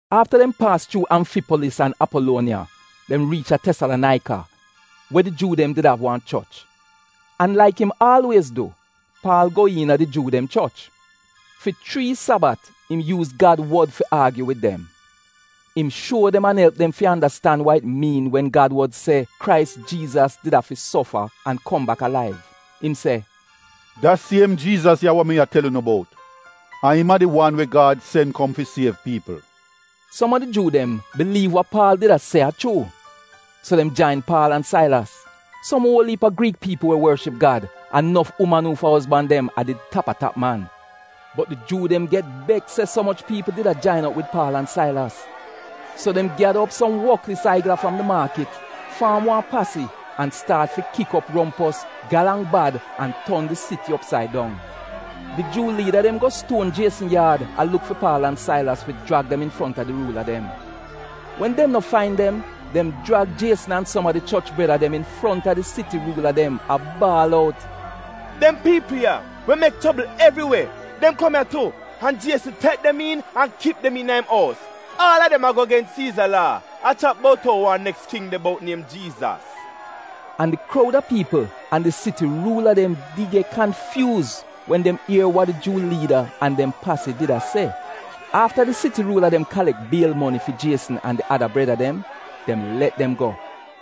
Afta dem paas chuu Amfipolis an Apoluoniya dem riich a Tesalonaika, we di Juu dem did av wan choch. An laik im aalwiez du, Paal go iina di Juu dem choch. Fi chrii Sabat im yuuz Gad wod fi aagyu wid dem. Im shuo dem an elp dem fi andastan wa it miin wen Gad wod se Krais Jiizas did afi sofa an kom bak alaiv. Im se, “Da siem Jiizas ya we mi a tel unu bout, a im a di wan we Gad sen kom fi siev piipl.” Som a di Juu dem biliiv wa Paal did a se a chuu, so dem jain Paal an Sailas. Som uol iip a Griik piipl we worship Gad an nof uman uufa ozban dem a did tap-a-tap man. Bot di Juu dem get beks se so moch piipl did jain op wid Paal an Sailas. So dem gyada op so woklis aigla fram di maakit, faam wan pasi, an staat fi kik op rompos, galang bad an ton di siti opsaid dong. Di Juu liida dem go stuon Jiesn yaad, a luk fi Paal an Sailas fi jrag dem infronta di ruula dem. Wen dem no fain dem, dem jrag Jiesn an som a di choch breda dem infronta di siti ruula dem a baal out, “Dem piipl ya we mek chobl evriwe, dem kom ya tu, an Jiesn tek dem iin an a kip dem im ous! Aal a dem ago gens Siiza laa, a chat bout ou wan neks king de bout niem Jiizas!” An di kroud a piipl an di siti ruula dem did get kanfyuuz wen dem ier wa di Juu liida an dem pasi did a se. Afta di siti ruula dem kalek biel moni fi Jiesn an di ada breda dem, dem let dem go.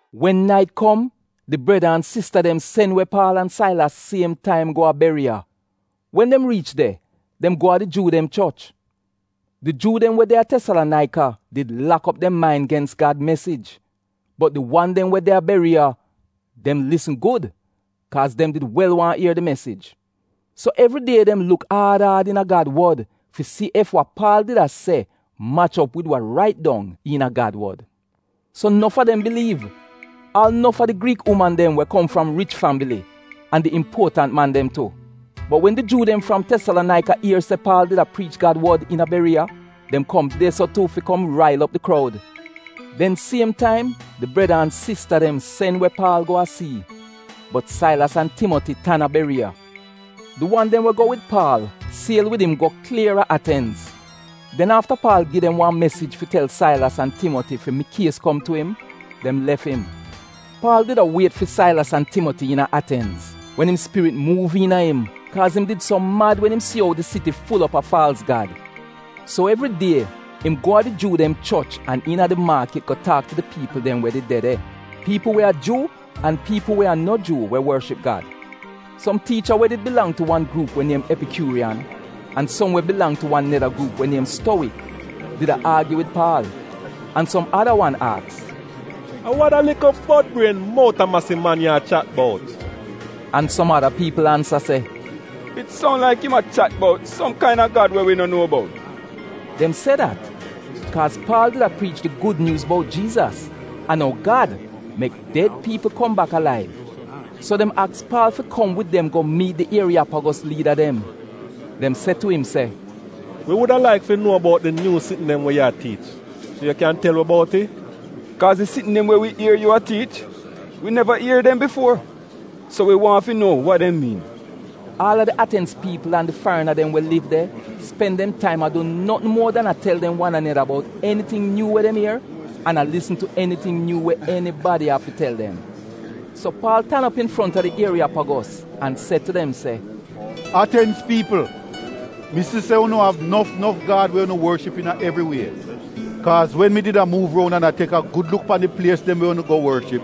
Wen nait kom di breda an sista dem sen we Paal an Sailas siem taim go a Beriya. Wen dem riich de, dem go a di Juu dem choch. Di Juu dem we de a Tesalonaika di lak op dem main gens Gad mesij. Bot di wan dem we de a Beriya, dem lisn gud kaaz dem did wel waahn ier di mesij. So evri die dem luk aad aad iina Gad wod fi si ef wa Paal did a se mach op wid wa rait dong iina Gad wod. So nof a dem biliiv, aal nof a di Griik uman dem we kom fram rich fambili an di impuotant man dem tu. Bot wen di Juu dem fram Tesalonaika ier se Paal did a priich Gad wod iina Beriya, dem kom de-so tu fi kom rail op di kroud. Den siem taim di breda an sista dem sen we Paal go a sii, bot Sailas an Timoti tan a Beriya. Di wan dem we go wid Paal siel wid im go klier a Atenz. Den afta Paal gi dem wan mesij fi tel Sailas an Timoti fi mikies kom tu im, dem lef im. Paal did a wiet fi Sailas an Timoti iina Atenz wen im spirit muuv iina im kaaz im did so mad wen im si ou di siti ful op a faalz gad. So evri die im go a di Juu dem choch, an iina di maakit go taak tu di piipl dem we did de de; piipl we a Juu an piipl we a no Juu we worship Gad. Som tiicha we did bilang tu wan gruup we niem Epikyuuriyan an som we bilang tu wan neda gruup we niem Stowik did a aagyu wid Paal. An som ada wan aks, “A wa da likl bod-brien, mout-a-masi man ya a chat bout?” An som ada piipl ansa se, “It soun laik im a chat bout som kaina gad we wi no nuo bout.” Dem se dat kaaz Paal did a priich di Gud Nyuuz bout Jiizas an ou Gad mek ded piipl kom bak alaiv. So dem aks Paal fi kom wid dem go miit di Ieriyapagos liida dem. Dem se tu im, “Wi wuda laik fi nuo bout di nyuu sitn dem we yu a tiich, so yu kyan tel wi bout it? Kaaz di sitn dem we wi ier yu a tiich, wi neva ier dem bifuo, so wi waahn fi nuo wa dem miin.” Aal a di Atenz piipl an di farina dem we liv de spen dem taim a du notn muor dan a tel dem wan aneda bout eniting nyuu we dem ier an a lisn tu eniting nyuu we enibadi av fi tel dem. So Paal tan op infronta di Ieriyapagos an se tu dem se, “Atenz piipl mi si se unu av nof nof gad we unu worship iina evri wie. Kaaz wen mi did a muuv roun an a tek a gud luk pan di plies dem we unu go worship,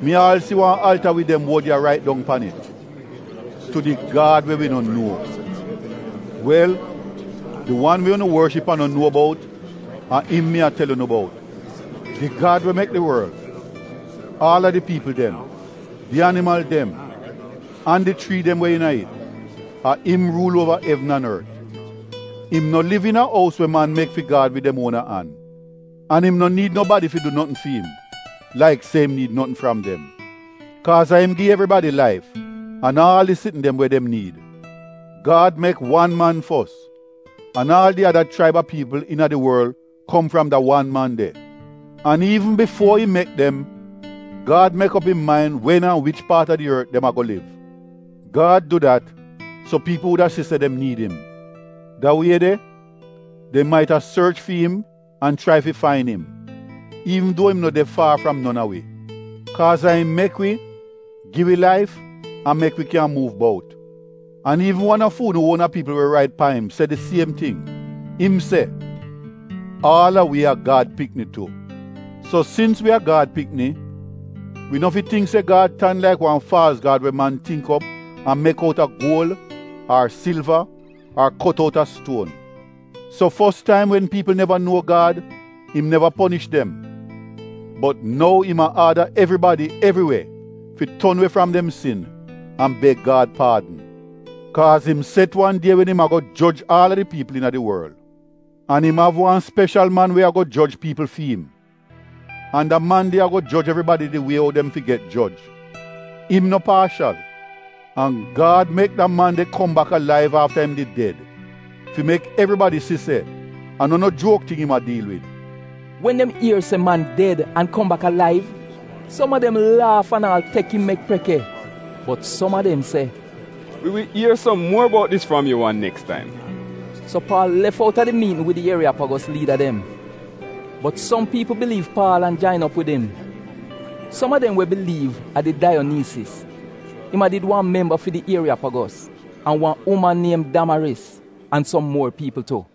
mi aal si wan alta wid dem wod ya rait dong pan it, ‘Tu di Gad we wi no nuo.’ Wel di wan we unu worship an no nuo bout, a im mi a tel unu bout. Di Gad we mek di worl, aal a di piipl dem, di animal dem, an di chrii dem we iina it, a im ruul uova evn an ort. Im no liv iina ous we man mek fi Gad wid dem uona an. An im no niid nobadi fi du notn fi'im, laik se im niid notn fram dem niida, kaaz a im gi evribadi laif an aal di sitn dem we dem niid. Gad mek wan man fos an aal di ada chraib a piipl iina di worl kom fram da wan man de. An iivn bifuo im mek dem, Gad mek op im main wen an wich paat a di ort dem ago liv. Gad du dat so piipl wuda si se dem niid im. Da wie de dem maita sorch fi'im an chrai fi fain im, iivn duo im no de far fram non a wi. Kaaz a im mek wi, gi wi laif, an mek wi kyan muuv bout. An iivn wan a fu'unu uona piipl we rait paim se di siem ting, im se, ‘Aal a wi a Gad pikni tu.’ “So sins wi a Gad pikni, wi no fi tingk se Gad tan laik wan faalz gad we man tingk op an mek outa guol, ar silva, ar kot outa stuon. So fos taim wen piipl neva nuo Gad, im neva ponish dem. Bot nou im a aada evribadi evri we fi ton we fram dem sin an beg Gad paadn, kaaz im set wan die wen im ago joj aal a di piipl iina di worl. An im av wan speshal man we ago joj piipl fi'im, an da man de ago joj evribadi di wie ou dem fi get joj — im no paashal. An Gad mek da man de kom bak alaiv afta im did ded fi mek evribadi si se a no no juok ting im a diil wid.” Wen dem ier se man ded an kom bak alaiv, som a dem laaf an aal tek im mek preke, bot som a dem se, “Wi wi ier som muor bout dis fram yu wan neks taim.” So Paal lef outa di miitn wid di Ieriyapagos liida dem. Bot som piipl biliiv Paal an jain op wid im. Som a dem we biliiv a did Daiyoniisis, im a did wan memba fi di Ieriyapagos, an wan uman niem Damaris, an som muor piipl tu.